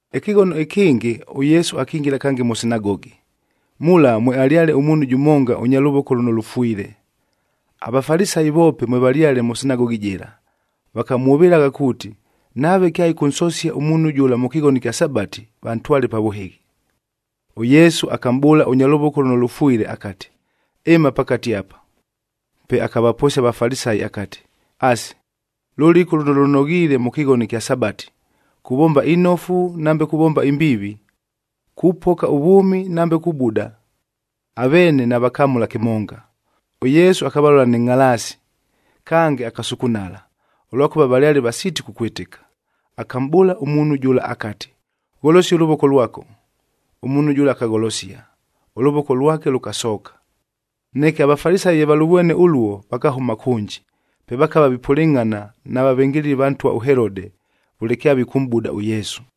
Ɨkɨghono ɨkɨngɨ, ʉYesu akingila kange mʉ sinagogi, mula mwealyale ʉmuunhu jʉmonga ʉnya lʉvoko lʉno lʉfwile. AVafalisayi voope mwevalyale mʉ sinagogi jɨla, vakamwʉvɨlagha kuuti, nave kyaɨkʉnsosia ʉmuunhu jʉla mʉ kɨghono ɨkya Sabati, vantwale pa vʉhɨghi. ɄYesu akamʼbʉʉla ʉnya lʉvoko lʉno lʉfwile akati, “Ɨma pakate apa.” Pe akavaposia aVafalisayi akati, “Asi, lʉlɨku lʉno lʉnoghiile mʉ kɨghono ɨkya Sabati! Kuvomba inofu nambe kuvomba imbiivi? Kupoka ʉvwʉmi nambe kubuda?” Aveene navakamʉla kɨmonga. ɄYesu akavalola nɨ ngʼhalaasi, kange akasukunala, ʉlwakʉva valyale vasiiti kukwɨtɨka. Akamʼbʉʉla ʉmuunhu jʉla akati, “Gholosia ʉlʉvoko lwako.” Ʉmuunhu jʉla akagholosia, ʉlʉvoko lwake lʉkasooka. Neke aVafalisayi ye valʉvwene ʉluo, vakahʉma kʉnji, pe vakava vipʉlɨngʼhana na vavɨngɨlɨli va ntwa ʉHelode,a vʉle kyavikʉmʼbuda ʉYesu.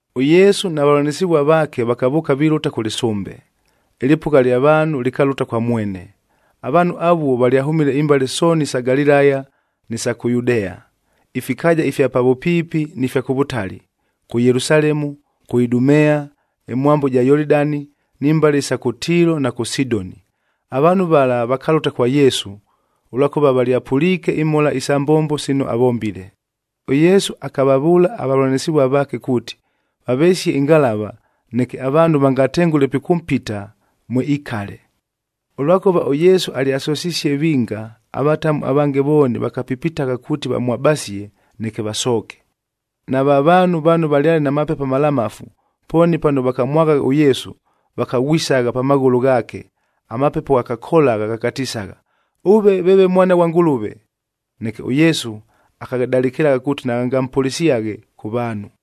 ɄYesu na vavʉlanɨsɨvua vaake vakavʉʉka vilʉta kʉ lɨsʉmbe. Ɨlɨpʉgha lya vaanhu lɨkalʉta kwa mwene. Avaanhu avuo valyahʉmile imbale sooni isa Galilaya ni sa kʉ Yudea, ifikaaja ifya pa vʉpiipi ni fya kʉ vʉtali: kʉ Yelusalemu, kʉ Idumea, ɨmwambo ɨja Yolidani, ni mbale isa kʉ Tiilo na kʉ Sidoni. Avaanhu vala vakalʉta kwa Yesu, ʉlwakʉva valyapʉliike imhola isa mbombo sino avombile. ɄYesu akavavʉʉla avavʉlanɨsɨvua vaake kuuti, vavesie ɨngalava, neke avaanhu vangatengʉle pikʉmpita, mwe ikale. Ʉlwakʉva ʉYesu alyasosisie vinga, avatamu avange vooni vakapipitagha kuuti vamwabasie, neke vasooke. Nava vaanhu vano vaale na mapepo amalamafu, pooni pano vakamwaghagha ʉYesu, vakaghwisagha pa maghʉlʉ ghaake, amapepo ghakakolagha ghakatisagha, “Ʉve veeve Mwana ghwa Ngʉlʉve!” Neke ʉYesu akaghadalɨkɨla kuuti naghangampʉlɨsyaghe kʉ vaanhu.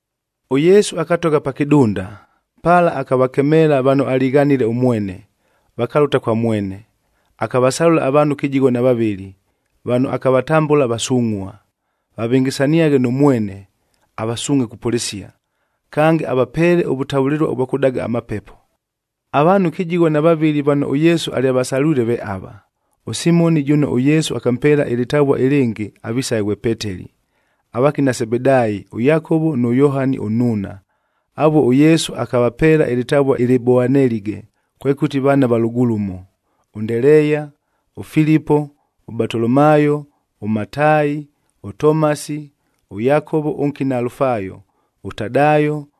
ɄYesu akatogha pa kɨdunda, pala akavakemeela vano alighanile ʉmwene, vakalʉta kwa mwene. Akavasalʉla avaanhu kɨjigho na vavɨlɨ, vano akavatambʉla vasungʼhua,b vavɨngɨsaniaghe nʉ mwene, avasuungʼhe kupʉlɨsia, kange avapeele ʉvʉtavʉlɨlua ʉvwa kʉdaga amapepo. Avaanhu kɨjigho na vavɨlɨ vano ʉYesu alyavasalwile ve ava: ʉSimoni jʉno ʉYesu akampeela ɨlɨtavua ɨlɨngɨ avisaghe ghwe Peteli, avakina Sebedaayi ʉYakovo nʉ Yohani ʉnnuuna, avuo ʉYesu akavapeela ɨlɨtavua ɨlɨ Boanelige, kwekʉti vaana va lʉgulumo, ʉNdeleeya, ʉFilipo, ʉBatolomaayo, ʉMataayi, ʉTomasi, ʉYakovo ʉnkina Alufaayo, ʉTadaayo,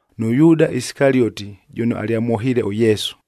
nʉ Yuuda Isikalioti jʉno alyamwohiile ʉYesu.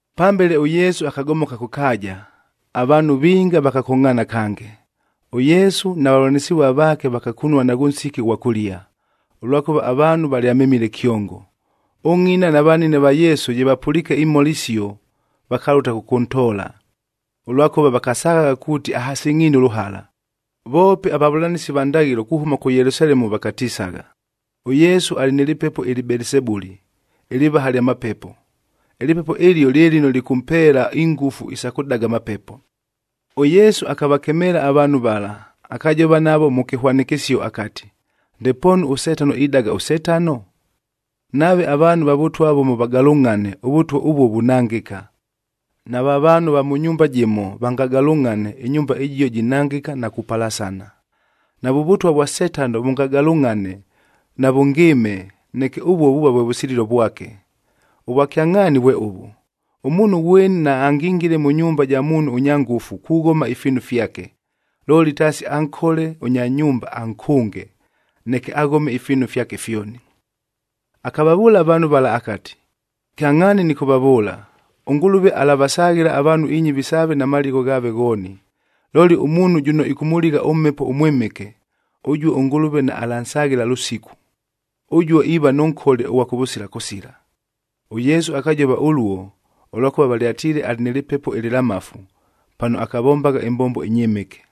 Pambele ʉYesu akagomoka kʉ kaaja, avaanhu vinga vakakongʼhaana kange. ɄYesu na vavʉlanɨsɨvua vaake vakakunua naghʉ nsiki ʉghwa kʉlia, ʉlwakʉva avaanhu valyamemile kyongo. Ʉngʼina na vanine va Yesu ye vapʉliike imhola isio, vakalʉta kʉkʉntoola, ʉlwakʉva vakasaghagha kuuti ahasɨngʼhiine ʉlʉhala. Voope avavʉlanɨsi va ndaghɨlo kuhʉma kʉ Yelusalemu vakatisagha, “ɄYesu alɨ nɨ lɨpepo ɨlɨ Belisebuli,d ɨlɨvaha lya mapepo. Ɨlɨpepo ɨlio lye lɨno lɨkʉmpeela ingʉfu isa kʉdaga amapepo.” ɄYesu akavakemeela avaanhu vala, akajova navo mʉ kɨhwanɨkɨsio akati, “Ndepoonu ʉSetano idaga ʉSetano? Nave avaanhu va vʉtwa vʉmo vagalʉngʼhane, ʉvʉtwa ʉvuo vunangɨka. Nava vaanhu va mʉ nyumba jɨmo vangagalʉngʼhane, ɨnyumba ɨjio jinangɨka na kupalasana. Navʉ vʉtwa vwa Setano vʉngagalʉngʼhane, navʉngɨɨme, neke ʉvuo vuuva vwe vʉsililo vwake. Ʉvwakyangʼhaani vwe ʉvʉ, ʉmuunhu ghweni naangingile mʉ nyumba ja muunhu ʉnya ngʉfu kughoma ifiinu fyake, looli taasi ankole ʉnya nyumba ankʉnge, neke aghome ifiinu fyake fyoni.” Akavavʉʉla avaanhu vala akati, “Kyangʼhaani nɨkʉvavʉʉla, ʉNgʉlʉve alavasaghɨla avaanhu inyɨvi saave na maligho ghaave ghooni. Looli ʉmuunhu jʉno ɨkʉmʉligha ʉMhepo ʉMwɨmɨke, ʉjuo ʉNgʉlʉve naalansaghɨla lʉsiku. Ʉjuo iiva nʉ nkole ʉghwa kʉvʉsila kʉsila.” ɄYesu akajova ʉluo, ʉlwakʉva valyatiile alɨ nɨ lɨpepo ɨlɨlamafu, pano akavombagha ɨmbombo ɨnyɨmɨke.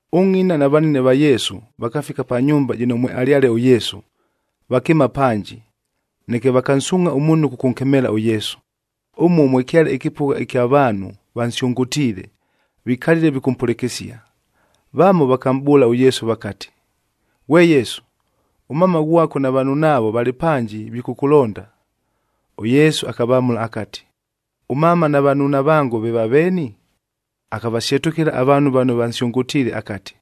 Ʉngʼina na vanine va Yesu vakafika pa nyumba jɨno mwealyale ʉYesu, vakɨɨma panji, neke vakansuungʼha ʉmuunhu kʉkʉnkemeela ʉYesu. Ʉmuo mwekyale ɨkɨpʉgha ɨkya vaanhu vansyʉngʉtiile, vikalile vikʉmpʉlɨkɨsia. Vamo vakamʼbʉʉlae ʉYesu vakati, “Ghwe Yesu, ʉmama ghwako na vanunaavo valɨ panji vikʉkʉlonda.” ɄYesu akavamʉla akati, “Ʉmama na vanuuna vango, ve vaveeni?” Akavasyetʉkɨla avaanhu vano vansyʉngʉtiile akati,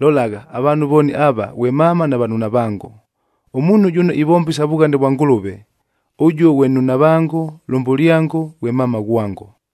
“Lolagha, avaanhu vooni ava ghwe mama na vanunavango. Ʉmuunhu jʉno ivomba isa vughane vwa Ngʉlʉve, ʉjuo ghwe nnunavango, lʉmbʉlyango, ghwe mama ghwango.”